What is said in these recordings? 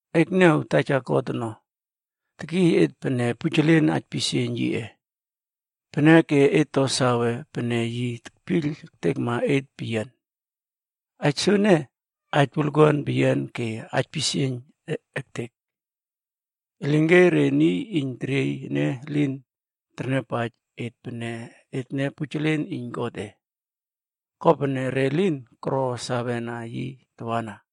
Ekniaw! Taja God ono, tekiy et pene pujelen aipisieiyn yiꞌe. Peneke et to save pene yi tekpiyl ektekma et peyian. Aij soene, aij wolkuan peyian ke aipisieiyn ektek. Elinke re niy iyn teriey ene elin terniawpaij et pene etne pujelen iyn Godꞌe. Kopene re lin koro sawena yi tawana.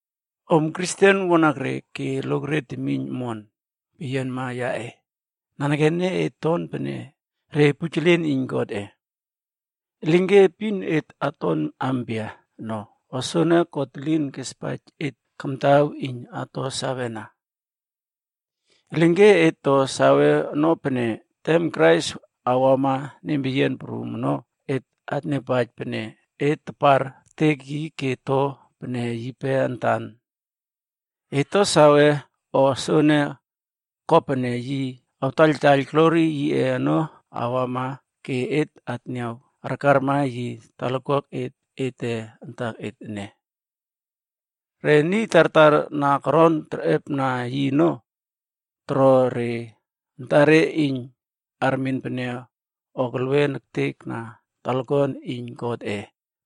Om Kristen wanakre ke lokre temiyn omon peyianma yaꞌe, nanekene et ton pene re pujelen iyn Godꞌe. Elinke epin et aton ampia ono, o soene God elin kespaij et kamtaw iyn ato sawena. Elinke et to sawe ono pene, tem Krais awama nempeyian prum ono, et atniawpaij pene, et tapar ektek yi ke to pene yipe antan. Et ato sawe no a soene, kopene yi awtaiyltaiyl glori yiꞌe ono awama ke et atniaw arkarma yi talakuaket ete antaket ene. Re niy tartar na koron terꞌepna yi ono, toro re antare iyn armen pene o kelwen ektek na talakuan iyn Godꞌe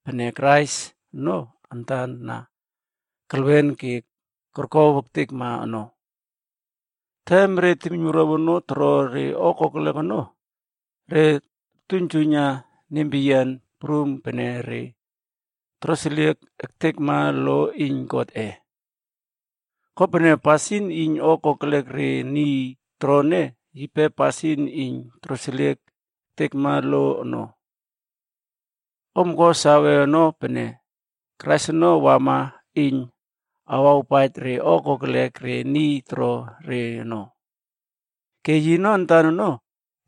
pene Krais ono antan na kelwen ke korkow ektekma ono. Tem re temiynwuruaw ono toro re o kokelek ono, re tortuiynjuiyna nempeyian prum pene re toroseliek ektekma lo iyn Godꞌe. Kopene pasin iyn o kokelek re niy toro ene, yipe pasin iyn toroseliek ektekma lo ono. Om ko sawe ono pene, Krais ono wama iyn awawpaij re o kokelek re niy toro re ono. Ke yino antan ono,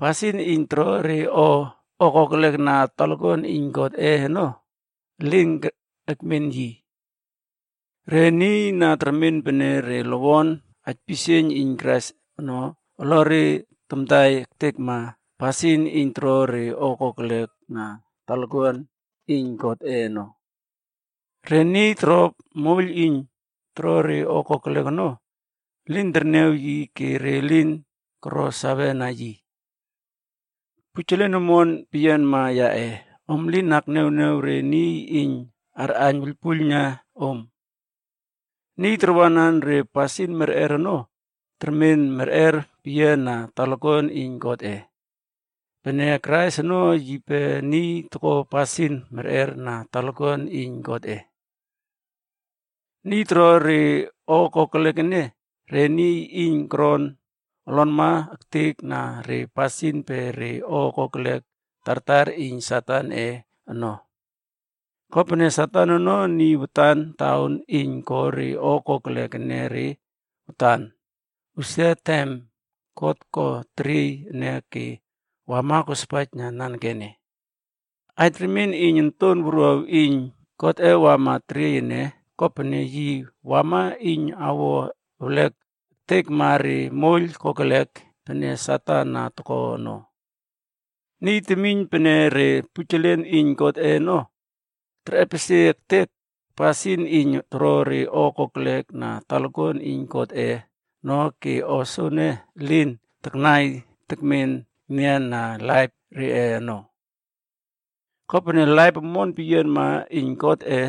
pasin iyn toro re o kokelek na talakuan iyn Godꞌe ono, elin ekmen yi. Re niy na termen pene re lowon aipisieiyn iyn Krais ono, olore tamtai ektekna pasin iyn toro re o kokelek na talakuan iyn Godꞌe ono. Re niy toro moiyl iyn toro re o kokelek ono, elin kerniaw yi ke re elin koro sawena yi. Pujelen omon peyianma yaꞌe, om lin akniawniaw re niy iyn arꞌaiyn wuiylpuiylna om. Niy tarwanan re pasin merꞌer ono, termen merꞌer peyian na talakuan iyn Godꞌe pene Krais ono yipe niy toko pasin merꞌer na talakuan iyn Godꞌe. Niy toro re o kokelek ene, re niy iyn koron olonma ektek na re pasin pe re o kokelek tartar iyn Satanꞌe ono.a Kopene Satan ono niy watan taon iyn ko re o kokelek enere watan, usia tem God ko teriey ene ke wama kospaijna nanekene. Aij remien iyn Onton Wuruaw iyn Godꞌe wama teriey ene, kopene yi wama iyn awo ewlek ektekma re moiyl kokelek pene Satan na toko ono. Niy termen pene re pujelen iyn Godꞌe ono, terꞌepesie ektek pasin iyn toro re o kokelek na talakuan iyn Godꞌe ono ke o soene elin taknai tekmen enian na laip reꞌe ono. Kopene laip omon peyianma iyn Godꞌe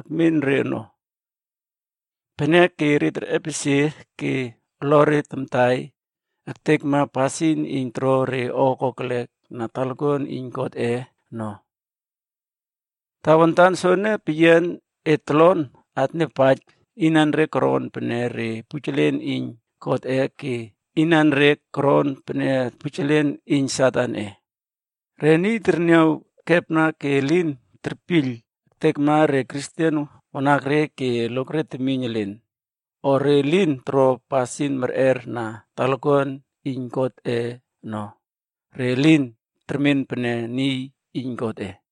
ekmen re ono. Peneke re terꞌepesie ke olore tamtai ektekna pasin iyn toro re o kokelek na talakuan iyn Godꞌe ono. Tawantan soene peyian, et tolon atniawpaij inanre koron pene re pujelen iyn Godꞌe ke inanre koron pene pujelen iyn Satanꞌe. Re niy terniaw ekepna ke elin terpiyl ektekma re Kristen wanakre ke lokre temiyn elen, o re lin toro pasin merꞌer na talakuan iyn Godꞌe ono, re elin termen pene niy iyn Godꞌe.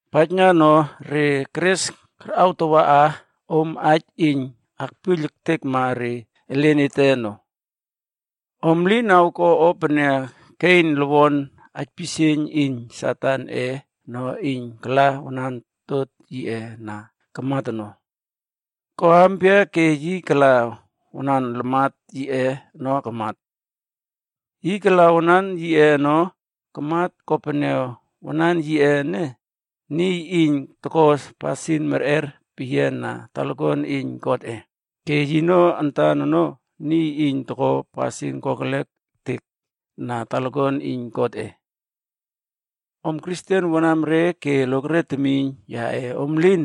Paijna no, re keres karꞌawtawa om aij iyn akpiyl ektekma re elen ete ono. Om lin awko o pene Kein, lowon aipisieiyn iyn Satanꞌe ono iyn kala wanan totot yiꞌe na kamat ono. Ko ampia ke yi kala wanan lamat yiꞌe ono kamat? Yi kala wanan yiꞌe ono kamat kopene wanan yiꞌe ene, niy iyn toko pasin merꞌer peyian na talakuan iyn Godꞌe ke yino antan ono, niy iyn toko pasin kokelek ektek na talakuan iyn Godꞌe. Om Kristen wanamre ke lokre temiyn yaꞌe, om lin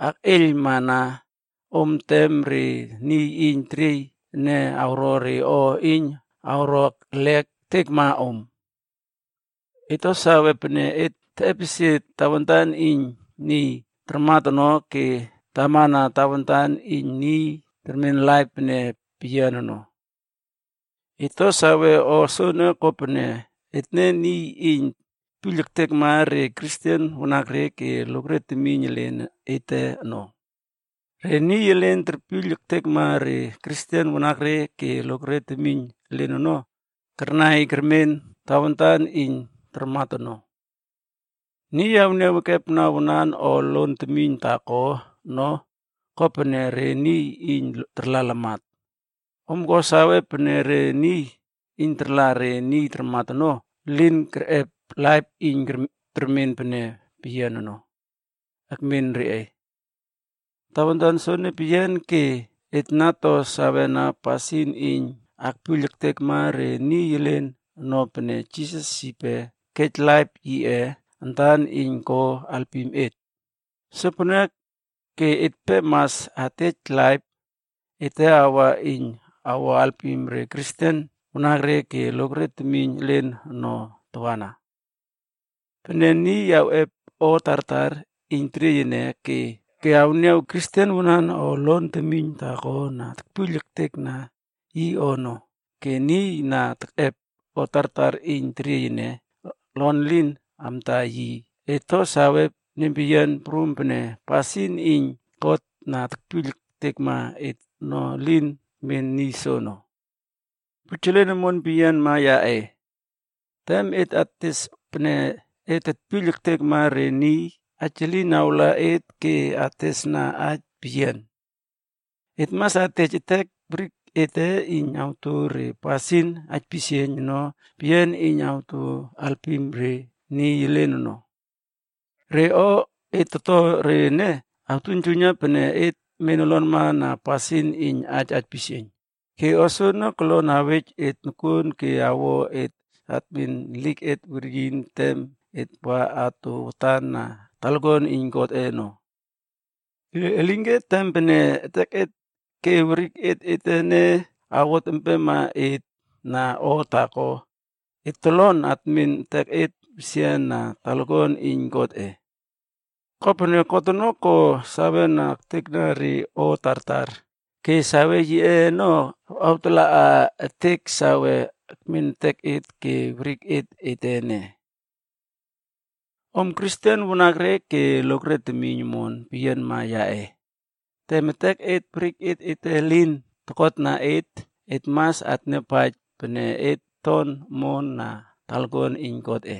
akꞌeiylmana om tem re niy iyn teriey ene awro re o iyn awro erlek ektekma om. Et to sawe pene et teꞌepesie tawantan iyn niy tarmat ono ke tamana tawantan iyn niy termen laip pene peyian ono. Et to sawe o soene kopene etne niy iyn tetpiyl ektekma re Kristen wanakre ke lokre temiyn elen ete ono. Re niy elin terpiyl ektekma re Kristen wanakre ke lokre temiyn elen ono karnai kermen tawantan iyn tarmat ono. Niy awniaw ekepna wanan o lon temiyn taako ono, kopene re niy iyn tarla lamat. Om ko sawe pene re niy iyn tarla re niy tarmat ono elin kerꞌep laip iyn termen pene peyian ono, ekmen re. Tawantan soene peyian ke et na to sawena pasin iyn akpiyl ektekma re niy elen ono pene Jisas yipe kej laip yiꞌe antan iyn ko alpim et. Sopeneke etpe mas atej laip ete awa iyn awo alpim re Kristen wanakre ke lokre temiyn elen ono tawana. Pene niy awꞌep o tartar iyn teriey ene ke awniaw Kristen wanan o lon temiyn taako na tekpiyl ektekna yi o ono, ke niy na keꞌep o tartar iyn teriey ene olon elin awtaiyn yi, et to sawe nempeyian prum pene pasin iyn God na tekpiyl ektekma et ono, elin ekmen niy soono. Pujelen omon peyianma yaꞌe, tem et ates pene et tekpiyl ektekma re niy, aij elin awla et ke atesna aij peyian. Et mas atej etek werik ete iyn ato re pasin aipisieiyn ono peyian iyn ato alpim re niy elen ono. Re o et toto re ene, artuiynjuiyna pene et men olonma na pasin iyn aij aipisieiyn. Ke o soene kolon awej et nokuon ke awo et atmen eliket weryin tem et wa ato watan na talakuan iyn Godꞌe ono. Elinke tem pene eteket ke weriket ete ene awot empema et na o taako, et tolon atmen eteket wesian na talakuan iyn Godꞌe. Kopene, God ono ko sawe ektekna re o tartar, ke save yiꞌe ono awtalaꞌa ektek sawe akmen eteket ke weriket ete ene. Om Kristen wanakre ke lokre temiyn omon peyianma yaꞌe, tem etek werik ete elin tokotna et, et mas atniawpaij pene et ton omon na talakuan iyn Godꞌe.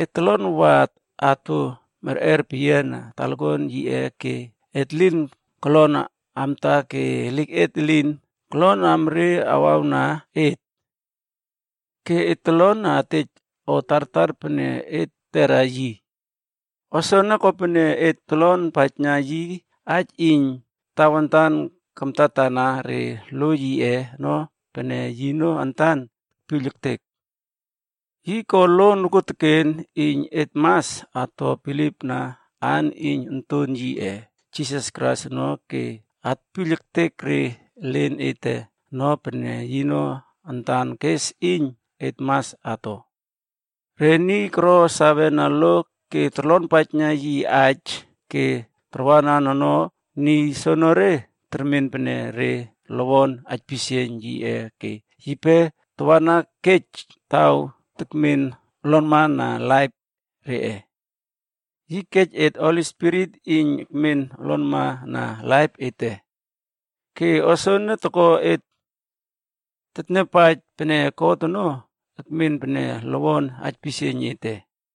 Et tolon wa ato merꞌer peyiana talakuan yiꞌe ke et elin kolon amta ke eliket elin kolon amre awawna et. Ke et tolon atej o tartar pene et tetera yi. O soene kopene et totlonpaijna yi aij iyn tatwanan kamtatana re lo yiꞌe ono pene yino antan tekpiyl ektek. Yi ko lo nokuoteken iyn et mas ato bilipna aan iyn Onton yiꞌe Jisas Krais ono ke atpiyl ektek re elen ete ono pene yino antan kes iyn et mas ato. Re niy koro sawena lo ke torlonpaijna yi aij ke tarwanan ono, niy soenere termen pene re lowon aipisieiyn yiꞌe ke yipe tawana kej taw tekmen olonma na laip reꞌe. Yi kej et Holi Spirit iyn ekmen olonma na laip ete. Ke o soene toko et tetniawpaij pene God ono ekmen pene lowon aipisieiyn ete.